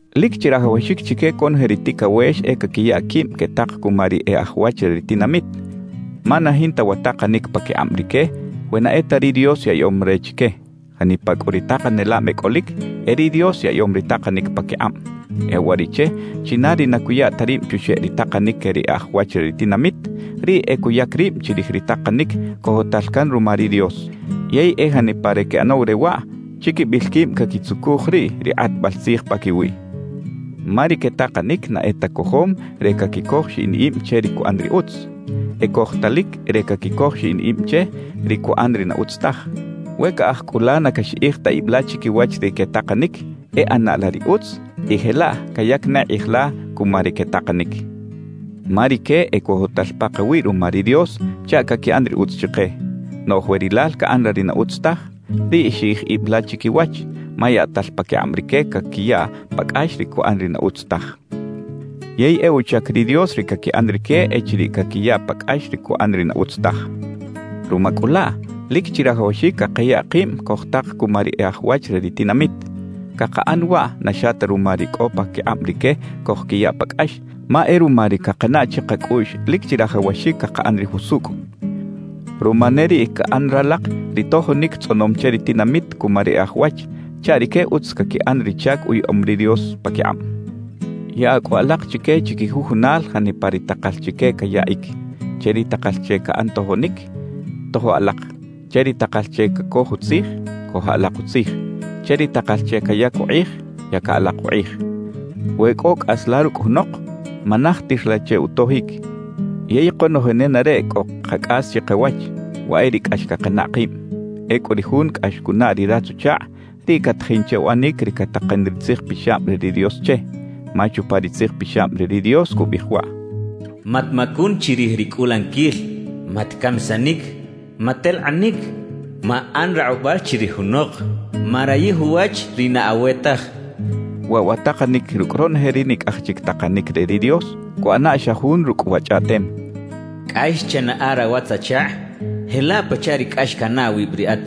Lic chirajawaxic chique conoje ri ticawex e caquiya quib quetak cuma ri e aj wach re ri tinamit, ma na jinta wa takanic paquikꞌab rique we na e ta ri Dios yaꞌyom re chique. Janipa cꞌu ri takanelab e cꞌolic, e ri Dios yaꞌyom ri takanic paquikꞌab. E uwariꞌche china ri na cuya ta rib chuxeꞌ ri takanic que ri e aj wach re ri tinamit, riꞌ e cuyac rib chirij ri takanic cojotal can ruma ri Dios. Yey e janipa ri queꞌanaw re waꞌ, chiquibil quib caquitzucuj riꞌ ri kꞌatbal tzij paquiwiꞌ. Ma ri quetakanic na e ta cojom re caquicoj xiꞌin ib che ri cuꞌan ri utz; ecojtalic re caquicoj xiꞌin ib che ri cuꞌan ri na utz taj. We caꞌaj cꞌu la na caxiꞌij ta ib la chiquiwach ri quetakanic, e ꞌana la ri utz y jelaꞌ cayac ne kꞌij la cuma ri quetakanic. Ma rique ecojotal pakawiꞌ ruma ri Dios chaꞌ caquiꞌan ri utz chike. Noꞌj we rilal caꞌan la ri na utz taj, riꞌ xiꞌij ib la chiquiwach, ma yaꞌtal paquikꞌab rique caquiya pa cꞌax ri cuꞌan ri na utz taj. Yey e uchac ri Dios ri caquiꞌan rique echiriꞌ caquiya pa cꞌax ri cuꞌan ri na utz taj. Ruma cꞌu laꞌ, lic chirajawaxic cakaya kib cojtak cuma ri e aj wach re ri tinamit. Cakaꞌan waꞌ na xa ta ruma ri cꞌo paquikꞌab rique cojquiya pa cꞌax, ma e ruma ri cakanaꞌ chikacꞌuꞌx lic chirajawaxic cakaꞌan ri jusucꞌ. Ruma ne riꞌ caꞌan ralak ri tojonic tzꞌonom che ri tinamit cuma ri e aj wach, chaꞌ rique utz caquiꞌan ri chac uyaꞌom ri Dios paquikꞌab. Yaꞌa cꞌu alak chique chiquijujunal janipa ri takal chique cayaꞌic. Che ri takal che caꞌan tojonic, tojo alak. Che ri takal che cacoj utzij, cojo alak utzij. Che ri takal che cayac ukꞌij, yaca alak ukꞌij. We cꞌo cꞌas la rucꞌ junok, manajtir la che utojic. Yey konoje nenareꞌ cꞌo “kacꞌas” chikawach, waꞌ e ri cꞌax cakanaꞌ kib. Ecꞌu ri jun cꞌax cunaꞌ ri ratz-uchakꞌ, riꞌ catajin che uꞌanic ri catakan ri Tzij Pixab re ri Dios che. Ma chupa ri Tzij Pixab re ri Dios cubiꞌij waꞌ: «Matmacun chirij ri cꞌulaniquil. Matcamisanic. Matelkꞌanic. Maꞌan rakꞌubal chirij junok. Marayij uwach ri na awe taj.» Waꞌ wa takanic rucꞌ ronoje ri nicꞌaj chic takanic re ri Dios, cuꞌana xa jun rucꞌ wa chꞌaꞌtem: «Cꞌax chanaꞌa rawatz-achakꞌ jelaꞌ pachaꞌ ri cꞌax canaꞌ awib riꞌat.»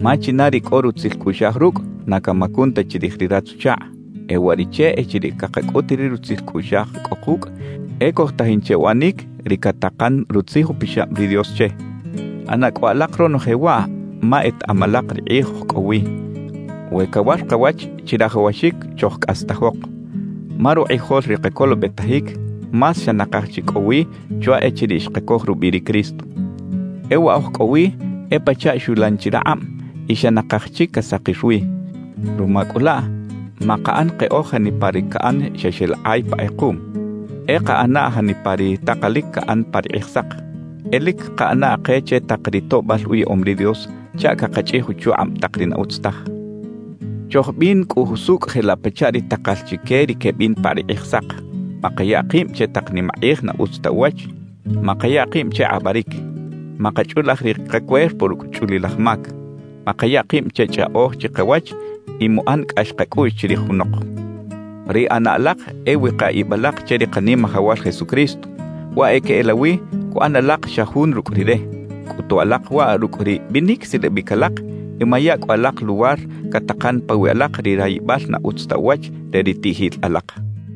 Ma china ri cꞌo rutzil cꞌuꞌxaj rucꞌ, na camacun ta chirij ri ratz-uchakꞌ. E uwariꞌche echiriꞌ cakacꞌut ri rutzil cꞌuꞌxaj cꞌo kucꞌ, e cojtajin che uꞌanic ri catakan Rutzij Upixab ri Dios che. ꞌAna cꞌu alak ronoje waꞌ ma etaꞌam alak ri kꞌij oj cꞌo wi. We cawar kawach, chirajawaxic chojcꞌastajok, ma rukꞌijol ri kacolobetajic más xa nakaj chi cꞌo wi chwa echiriꞌ xkacoj rubiꞌ ri Cristo. E wa oj cꞌo wi e pachaꞌ xulan chi rakꞌab y xa nakaj chic casakir wi. Ruma cꞌu laꞌ makaꞌan keꞌoj janipa ri caꞌan xa xeꞌlakꞌay pa kꞌekuꞌm; e kaꞌana janipa ri takalic caꞌan pa ri Kꞌijsak. E lic kaꞌana ke che tak ri toꞌbal uyaꞌom ri Dios chaꞌ cakachꞌij uchukꞌab tak ri na utz taj. Chojbin cꞌu jusucꞌ jelaꞌ pachaꞌ ri takal chique ri quebin pa ri Kꞌijsak. Makaya kib che tak nimakꞌij na utz ta uwach. Makaya kib che kꞌabaric. Makachꞌulaj ri kacuerpo rucꞌ chꞌulilaj mac. Makaya kib che chꞌaꞌoj chikawach y muꞌan cꞌax kacꞌuꞌx chirij junok. Ri ꞌana alak e wika ib alak che ri Kanimajawal Jesucristo; waꞌ e queꞌelawi cuꞌan alak xa jun rucꞌ Rire. Cꞌutu alak waꞌ rucꞌ ri binic silabic alak y maya cꞌu alak luwar catakan pawiꞌ alak ri rayibal na utz ta uwach re ri tiꞌjil alak.